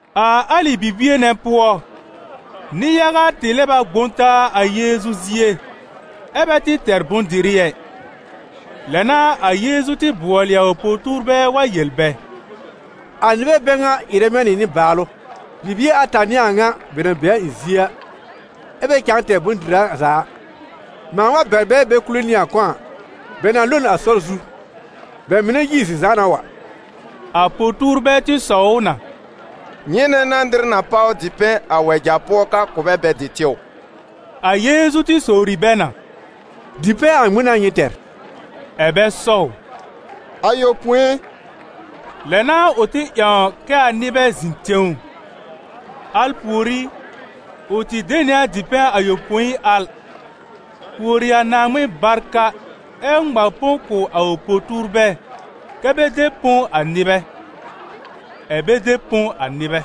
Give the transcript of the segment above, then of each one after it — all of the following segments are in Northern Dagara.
A alɩ bibie nɛ pʋɔ, nɩ-yaga tɩ lɛb a gbõ taa a Yeezu zie, ɛ́ bɛ tɩ tɛr bʋ̃-dɩrɩ ɛ; lɛ n'a a Yeezu tɩ bʋɔlɩ a ʋ po-tuurbɛ wa yel bɛ: «A nɩbɛ bɛ ŋa ɩrɛ mɛ̃ nɩ nɩbaalʋ, bibie ata n'ɩ a ŋa bɛ na be a ɩ̃ zie a, ɛ́ bɛ cãa tɛr bʋ̃-dɩra za a. Mãa wa bɛr bɛ bɛ kule nɩ a kɔ̃ a, bɛ na lo n a sɔr zu, bɛ mɩnɛ yi n zi-zãana wa. A po-tuurbɛ tɩ sɔw ʋ na: «Nyɩnɛ n'a nɩr na páw dipɛ̃ a wɛja pʋɔ ka kʋ̀ bɛ bɛ dɩ tɩw?» A Yeezu tɩ sowri bɛ na: «Dipɛ̃ a ŋmɩn n'a nyɩ tɛr?» Ɛ̀ bɛ sɔw: «Ayopõi!» Lɛ n'a ʋ tɩ ƴãw kɛ́ a nɩbɛ zɩ̃ tẽw; al pùorí ʋ tɩ de nɩ a dipɛ̃ ayopõi al, pùori a Naaŋmɩn barka ɛ́ ŋma põ kʋ̀ a ʋ po-tuurbɛ kɛ́ bɛ de põ a nɩbɛ. Ɛ̀ bɛ de põ a nɩbɛ.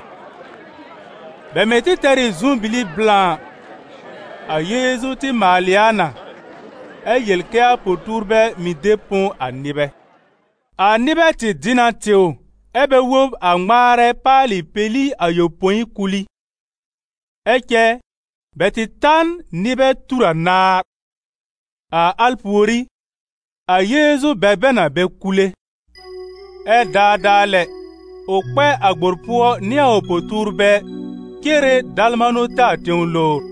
Bɛ mɩ̀ tɩ tɛr ɩ zʋm-bili blã. A Yeezu tɩ maalɩ a na, ɛ yel kɛ́ a po-tuurbɛ mɩ̀ de põ a nɩbɛ. A nɩbɛ tɩ dɩ na tɩw, ɛ́ bɛ wob a ŋmaarɛ paalɩ peli ayopõi kul ɩ. Ɛ cɛ bɛ tɩ ta n nɩbɛ tur anaar. A al pùorí, a Yeezu bɛr bɛ na bɛ kule. Ɛ daadaa lɛ ʋ kpɛ a gbor pʋɔ nɩ a ʋ po-tuurbɛ cere Dalmanuta tẽw lowr.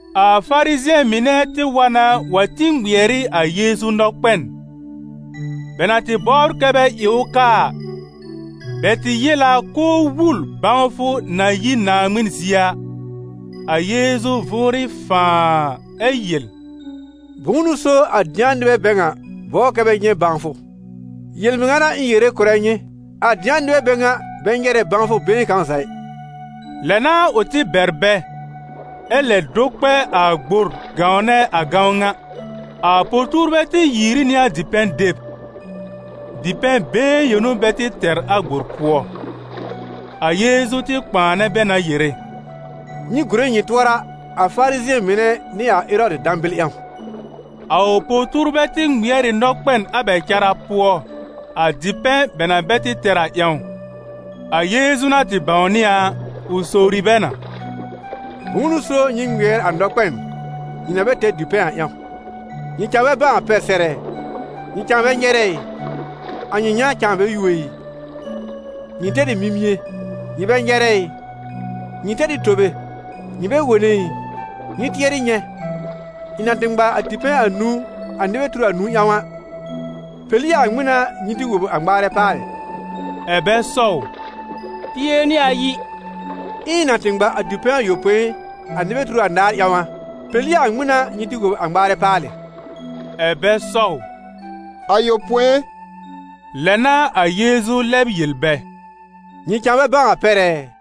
A Farizɩ̃ɛ mɩnɛ tɩ wa na wa tĩ ŋmɩɛr ɩ a Yeezu nɔkpɛn. Bɛ na tɩ bɔbr kɛ́ bɛ ɩ ʋ kaa a, bɛ tɩ yel a k'ʋʋ wul bãwfʋ na yi Naaŋmɩn zie a. A Yeezu vʋʋrɩ fãaa! Ɛ yel: «Bʋ̃ʋ n'ʋ so a dɩ̃a nɩbɛ bɛ ŋa bɔbr kɛ́ bɛ nyɛ̃ bãwfʋ? Yel-mɩŋa n'a ɩ̃ yere kʋ̀rɛ nyɩ, a dɩ̃a nɩbɛ bɛ ŋa bɛ nyɛrɛ bãwfʋ been kãw za ɩ.» Lɛ n'a ʋ tɩ bɛr bɛ, ɛ lɛ do kpɛ a gbor gãwnɛ a gãwn ŋa. A po-tuurbɛ tɩ yiiri nɩ a dipɛ̃ deb: dipɛ̃ been yõ n'ʋ bɛ tɩ tɛr a gbor pʋɔ. A Yeezu tɩ kpãanɛ bɛ na yere: «Nyɩ gùre nyɩ tʋɔra a Farizɩ̃ɛ mɩnɛ nɩ a Erɔdɩ dãbɩl ƴãw.» A ʋ po-tuurbɛ tɩ ŋmɩɛr ɩ nɔkpɛn a bɛ cara pʋɔ, a dipɛ̃ bɛ na bɛ tɩ tɛr a ƴãw. A Yeezu na tɩ bãwnɩ a, ʋ sowri bɛ na: «Bʋ̃ʋ n'ʋ so nyɩ ŋmɩɛr a nɔkpɛn nyɩ na bɛ tɛr a dipɛ̃ a ƴãw? Nyɩ cãa bɛ bãw a pɛr sɛr ɛ? Nyɩ cãa bɛ nyɛrɛ ɩ? A nyɩ yã cãa bɛ yuo ɩ? Nyɩ tɛr ɩ mimie, nyɩ bɛ nyɛrɛ ɩ? Nyɩ tɛr ɩ tobe, nyɩ bɛ wone ɩ? Nyɩ tɩɛrɩ nyɛ̃, ɩ̃ na tɩ ŋma a dipɛ̃ anũu a nɩbɛ tur anũu ƴãw a, peli a ŋmɩn n'a nyɩ tɩ wob a ŋmaarɛ paalɩ?» Ɛ̀ bɛ sɔw: «Pie nɩ ayi!» «Ɛ ɩ̃ na tɩ ŋma a dipɛ̃ ayopõi a nɩbɛ tur anaar ƴãw a, peli a ŋmɩn n'a nyɩ tɩ wob a ŋmaarɛ paalɩ?» Ɛ̀ bɛ sɔw: «Ayopõi!» Lɛ n'a a Yeezu lɛb yel bɛ: «Nyɩ cãa bɛ bãw a pɛr ɛ?»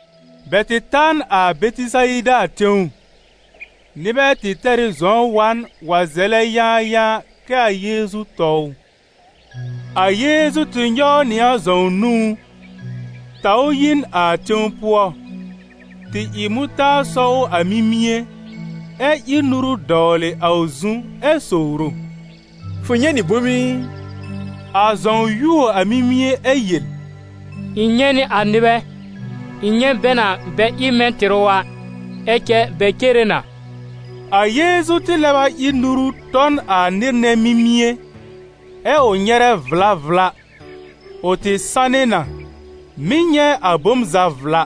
Bɛ tɩ ta n a Bɛtɩsayida tẽw. Nɩbɛ tɩ tɛr ɩ zɔ̃w wa n wa zɛlɛ yãayãa kɛ a Yeezu tɔ ʋ. A Yeezu tɩ nyɔw nɩ a zɔ̃w nũú, taw ʋ yi n a tẽw pʋɔ, tɩ ɩ mʋtaar sɔ ʋ a mimie, ɛ́ ír nuru dɔwlɩ a ʋ zu ɛ sowr ʋ: «Fʋ nyɛ̃ nɩ bom ɩ?» A zɔ̃w yuo a mimie ɛ yel: «Ɩ̃ nyɛ̃ nɩ a nɩbɛ, ɩ̃ nyɛ̃ bɛ na bɛ ɩ mɛ̃ tɩrʋ a, ɛ cɛ bɛ cere na!» A Yeezu tɩ lɛb a ír nuru tɔ n a nɩr nɛ mimie, ɛ́ ʋ nyɛrɛ vla vla, ʋ tɩ sanɩ na, mɩ́ nyɛ̃ a bom za vla.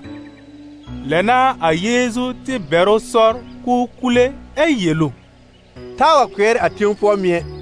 Lɛ n'a a Yeezu tɩ bɛr ʋ sɔr k'ʋʋ kule ɛ yel ʋ: «Taa wa kpɩɛr a tẽw pʋɔ mɩ̀ ɛ!»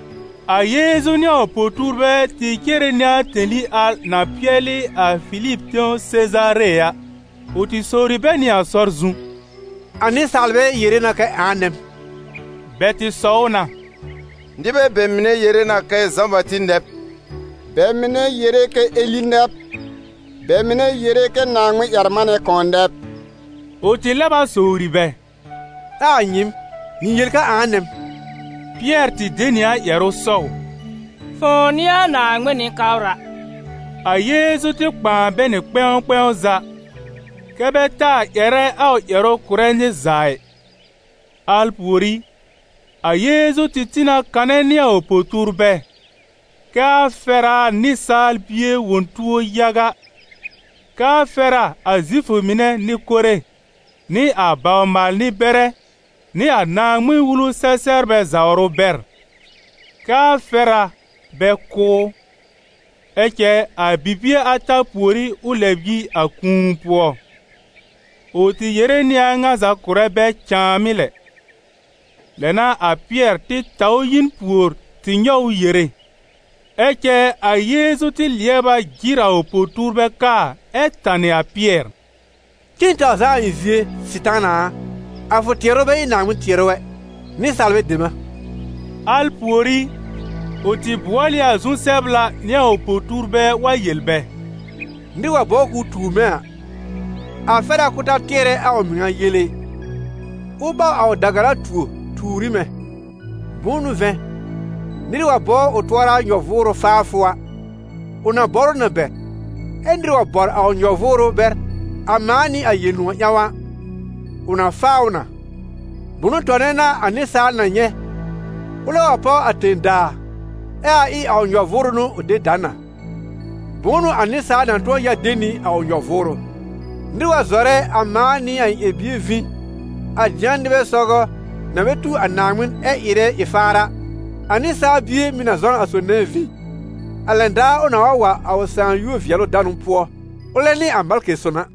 A Yeezu nɩ a ʋ po-tuurbɛ tɩ cere nɩ a tẽli al na pɩɛlɩ a Filib tẽw Sezaare a. Ʋ tɩ sowri bɛ nɩ a sɔr zu: «A nɩsaalbɛ yere na kɛ ãa nɛ m?» Bɛ tɩ sɔw na: «Nɩbɛ bɛ mɩnɛ yere na kɛ Zã-Bati nɛ b, bɛ mɩnɛ yere kɛ Eli nɛ b, bɛ mɩnɛ yere kɛ Naaŋmɩn-ƴɛr-manɛ kãw nɛ b!» Ʋ tɩ lɛb a sowri bɛ: «Ɛ a nyɩɩm, nyɩ yel kɛ ãa nɛ m?» Pɩɛr tɩ de nɩ a ƴɛrʋ sɔw: «Fʋ̃ʋ n'ɩ a Naaŋmɩn Nɩ-kabra!» A Yeezu tɩ kpãa bɛ nɩ kpɛ̃w kpɛ̃w za, kɛ́ bɛ taa ƴɛrɛ a ʋ ƴɛrʋ kʋ̀rɛ nɩr za ɩ. Al pùorí, a Yeezu tɩ tĩ na kanɛ nɩ a ʋ po-tuurbɛ, kɛ a fɛr a a Nɩsaal Bie wõ tuo yaga, kɛ a fɛr a a Zifʋ mɩnɛ Nɩ-kore nɩ a bawr-maal-nɩ-bɛrɛ nɩ a Naaŋmɩn-Wulu-sɛ-sɛbrbɛ zawr ʋ bɛr; kɛ a fɛr a bɛ kʋ́ ʋ, ɛ cɛ a bibie ata pùorí ʋ lɛb yi a kũu pʋɔ. Ʋ tɩ yere nɩ a a ŋa za kʋ̀rɛ bɛ cãamɩ́ lɛ. Lɛ n'a a Pɩɛr tɩ taw ʋ yi n pùor tɩ nyɔw ʋ yere. Ɛ cɛ a Yeezu tɩ lɩɛb a jɩr a ʋ po-tuurbɛ kaa ɛ tanɩ a Pɩɛr: «Cen taw zaa a ɩ̃ zie, Sɩtaana a, a fʋ tɩɛrʋ bɛ ɩ Naaŋmɩn tɩɛrʋ ɛ, nɩsaalbɛ dem a!» Al pùorí, ʋ tɩ bʋɔl ɩ a zu-sɛbla nɩ a ʋ po-tuurbɛ wa yel bɛ: «Nɩr wa bɔbr k'ʋʋ tuur mɛ̃ a, a fɛr a k'ʋʋ ta tɩɛrɛ a ʋ mɩŋa yele ɩ, ʋ ɓaw a ʋ da-gara tuo tuur ɩ mɛ̃. Bʋ̃ʋ n'ʋ vɛ̃, nɩr wa bɔbr ʋ tʋɔra nyɔ-vʋʋrʋ faafʋ a, ʋ na bɔr ʋ na bɛr, ɛ nɩr wa bɔr a ʋ nyɔ-vʋʋrʋ bɛr a mãa nɩ a Yel-nʋ̃ɔ̀ ƴãw a, ʋ na faa ʋ na. Bʋ̃ʋ tɔnɛ n'a a nɩsaal na nyɛ̃, ʋlɛ wa páw a tẽ-daa, ɛ a ɩ a ʋ nyɔ-vʋʋrʋ n'ʋ ʋ de da n a? Bʋ̃ʋ n'ʋ a nɩsaal na tʋ̃ɔ ya de nɩ a ʋ nyɔ-vʋʋrʋ? Nɩr wa zɔrɛ a mãa nɩ a ɩ̃ ƴɛr-bie vĩ, a dɩ̃a nɩbɛ sɔgɔ na bɛ tu Naaŋmɩn ɛ ɩrɛ ɩ-faar a, a Nɩsaal Bie mɩ̀ na zɔ n a sob nɛ vĩ, a lɛn daar ʋ nãà wa wa a ʋ Sãà yúor-vɩɛlʋ-danʋ pʋɔ, ʋlɛ nɩ a malkɩ son a.»